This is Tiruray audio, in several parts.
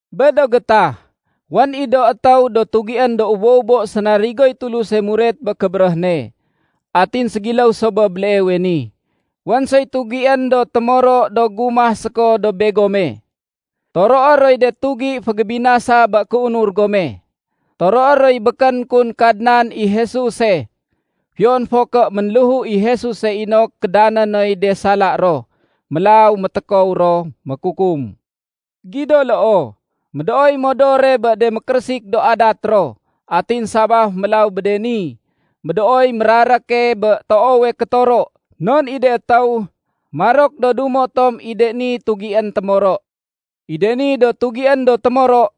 Bé do gétah, wén i do étéw do tugién do ubo-ubo sénarigoy Tuluse muret bé kébéréh ne. Atin ségiléw so bé béleewe ni, wén soy tugién do témoro do gumah séko dob begome. Toroé roy de tugi fégébinasa bé kéunur gome. Toroé roy békén kun Kadnan i Jesuse fiyon fo ké ménléhu i Jesuse inok kédané noy de sala ro. Mélaw métékow ro mékukum. Gido loo, médooy modore bé de mékérésik do adat ro. Atin sabaf mélaw bé ni, médooy méraréke bé toowe kétoro. Non i de étéw, marok do dumo tom i de ni tugién témoro. I de ni do tugién do témoro,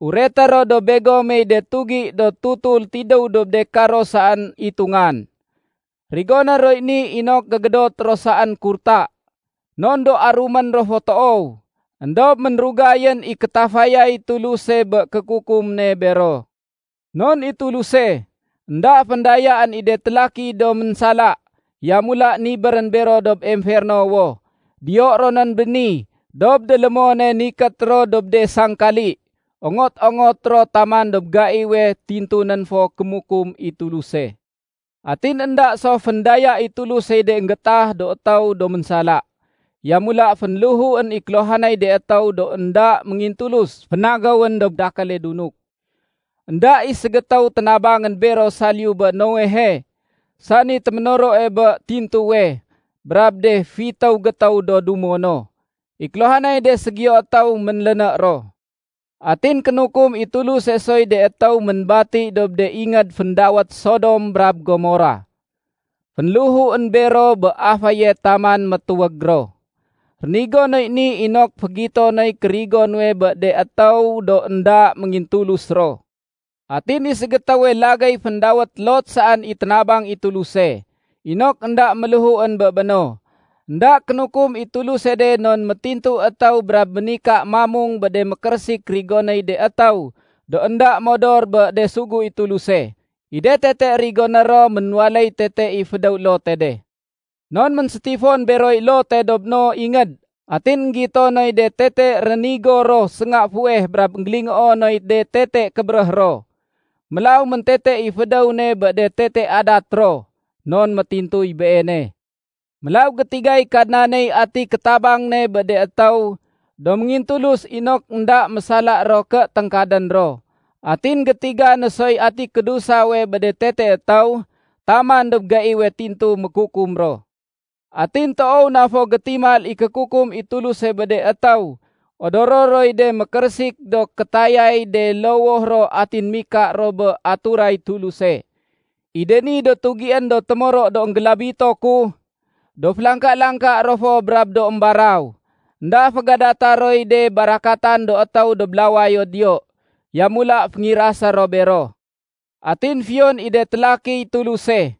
ureté ro dob begomey de tugi do tutul tidéw dob de karo saén itungan. Rigoné roy ni inok gégédot ro saén kurta, non do arumén ro fo toow. Endob ménrugayén i kétafayay Tuluse bé kékukum ne bero. Non i Tuluse, énda féndayaén i de télaki do ménsala, yamula nibérén bero dob emfernowo. Diyo ronén béni dob délémone nikét ro dob de sangkali, ongot-ongot ro taman dob gaiwe tintunén fo kémukum i Tuluse. Atin énda so féndaya i Tulusey de énggéétah do étéw do ménsala. Yamula fénléhuén i kéluhanay de étéw do énda méngintulus fénagéwén dob dakéle dunuk. Enda i ségétéw ténabangén bero saliyu bé Noehe, sani téménoroe bé tintuwe, brab de fitéw gétéw do dumo no. I kéluhanay de ségiyo étéw ménléné ro. Atin kénukum i Tuluse soy de étéw ménbati dob de ingéd féndawét Sodom brab Gomora. Fénléhuén bero bé aféye taman métuwég ro. Rénigo noy ni inok fégito noy kérigo nuwe bé de étéw do énda méngintulus ro. Atin i ségétéwe lagéy féndawét Lot saén i ténabang i Tuluse inok énda méléhuén bé béno. Enda kénukum i Tuluse de non métintu étéw brab ménika mamung bé de mékérésik rigonéy de étéw do énda modor bé de sugu i Tuluse. I de tete rigoné ro ménwaléy tete i fédéw Lote de. Non ménsétifon beroy Lote dob no ingéd atin énggito noy de tete rénigo ro sénga fuweh brab énggélingoo noy de tete kébéréh ro. Mélaw méntete i fédéw ne bé de tete adat ro, non métintuy beene. Mélaw gétigay Kadnaney ati kétabang ne bé de étéw do méngintulus inok énda mésala ro ké téngkadén ro. Atin gétiga no soy ati kédusawe bé de tete étéw taman dob gaiwe tintu mékukum ro. Atin toow na fo gétimal i kékukum i Tuluse bé de étéw odoro roy de mékérésik do kétayay de lowoh ro atin mika ro bé aturay Tuluse. I de ni do tugién do témoro do énggélabito ku, do félangka-langka ro fo brab do émbaraw. Enda fégadata roy de barakatan do étéw dob lawayo diyo. Yamula féngirasé ro bero. Atin fiyon i de télakiy Tuluse,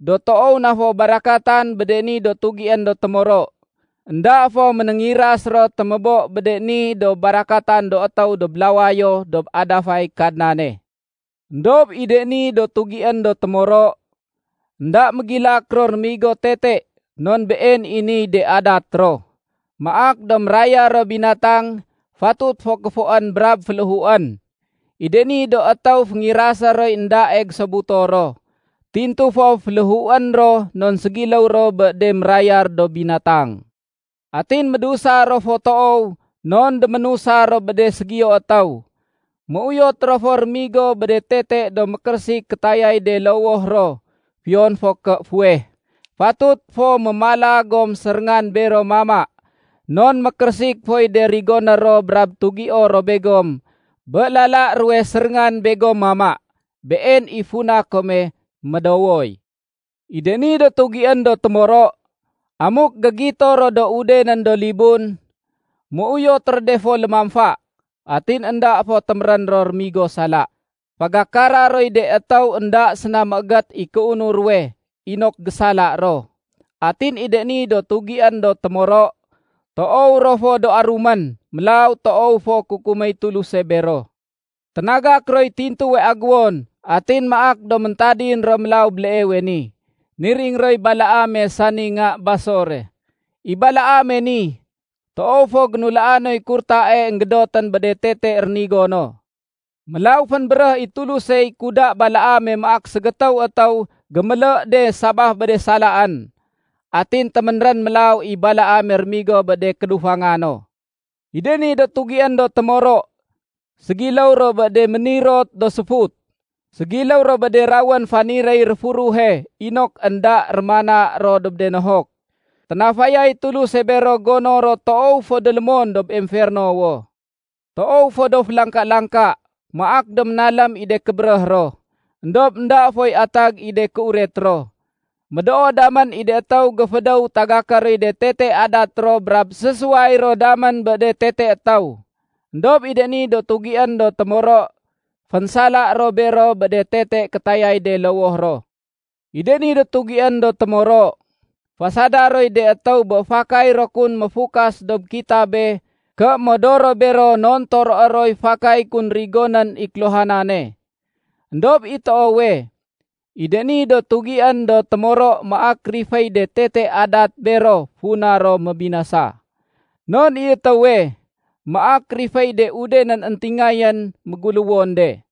do toow na fo barakatan bé de ni do tugién do témoro, énda fo ménéngiras ro témébo bé de ni do barakatan do étéw dob lawayo dob adafay Kadnane. Endob i de ni do tugién do témoro, énda mégilak ro rémigo tete non been i niy de adat ro, maak do mérayar ro binatang fatut fo kéfoén brab féléhuén. I de ni do étéw féngirasé roy éndae gésobuto ro. Tintu fo féléhuén ro non ségiléw ro bé de mérayar do binatang. Atin médusa ro fo toow non déménusa ro bé de ségiyo étéw. Méuyot ro fo rémigo bé de tete do mékérésik kétayay de lowoh ro fiyon ké fuweh. Fatut fo mémala gom séréngan bero mama non mékérésik foy de rigoné ro brab tugio ro begom bé lala ruwe séréngan begom mama. Been i funa kome médowoy. I de ni do tugién do témoro, amuk gégito ro do udenén do libun, méuyot ro de fo lémamfa. Atin énda fo témérén ro rémigo sala. Fagakara roy de étéw énda séna méégét i kéunur ruwe inok gésala ro. Atin i de ni do tugién do témoro, toow ro fo do arumén. Mélaw toow fo kukuméy Tuluse bero. Ténagak roy tintuwe aguwon atin maak do méntadin ro mélaw béleewe ni. Niring roy Balaame sani nga Basore. I Balaame ni, toow fo génulaa noy kurtae énggédotén bé de tete rénigo no. Mélaw fénbéréh i Tulusey kuda Balaame maak ségétéw étéw gémélé de sabaf bé de salaen. Atin téménrén mélaw i Balaame rémigo bé de kédufanga no. I de ni do tugién do témoro, ségiléw ro bé de ménirot do séfut. Ségiléw ro bé de rawén faniréy réfuruhe inok énda rémana ro dob de nohok. Ténafayay Tuluse bero gono ro toow fo délémon dob emfernowo. Toow fo do félangka-langka. Maak do ménalém i de kébéréh ro, éndob énda foy atag i de kéuret ro. Médoo damén i de étéw géfédéw tagaké roy de tete adat ro brab sésuway ro damén bé de tete étéw. Endob i de ni do tugién do témoro, fénsala ro bero bé de tete kétayay de lowoh ro. I de ni do tugién do témoro, fasada roy de étéw bé fakay ro kun méfukas dob kitabe ké modor ro bero non toroé roy fakay kun rigonén i kéluhanane. Endob i toowe, i de ni do tugién do témoro maak riféy de tete adat bero funa ro mébinasa. Non i étéwe, maak riféy de udenén éntingayén méguléwon de.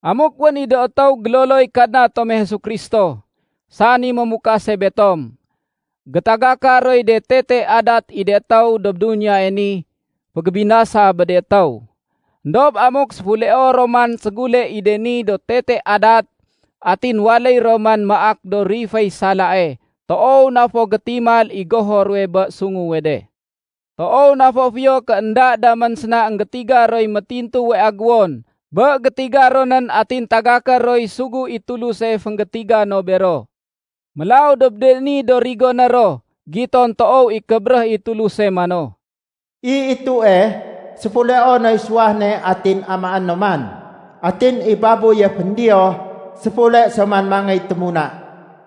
Amuk wén i do étéw géloloy Kadna tome Jesu Kristo, sani mémukase betom, gétagaka roy de tete adat i de étéw dob duniyae ni fégébinasa bé de étéw. Endob amuk séfuleo ro man ségule i de ni do tete adat atin waléy ro man maak do riféy salae, toow na fo gétimal i goho ruwe bé sunguwe de. Toow na fo fiyo ké énda damén séna énggétiga roy métintuwe aguwon bé gétiga ronén atin tagaké roy sugu i Tuluse fénggétiga no bero. Mélaw dob de ni do rigoné ro, giton toow i kébéréh i Tuluse mano, “I itue, séfuleo noy suwah ne atin amaé no man. Atin i babuye féndiyoh séfule so man mangéy témuna.”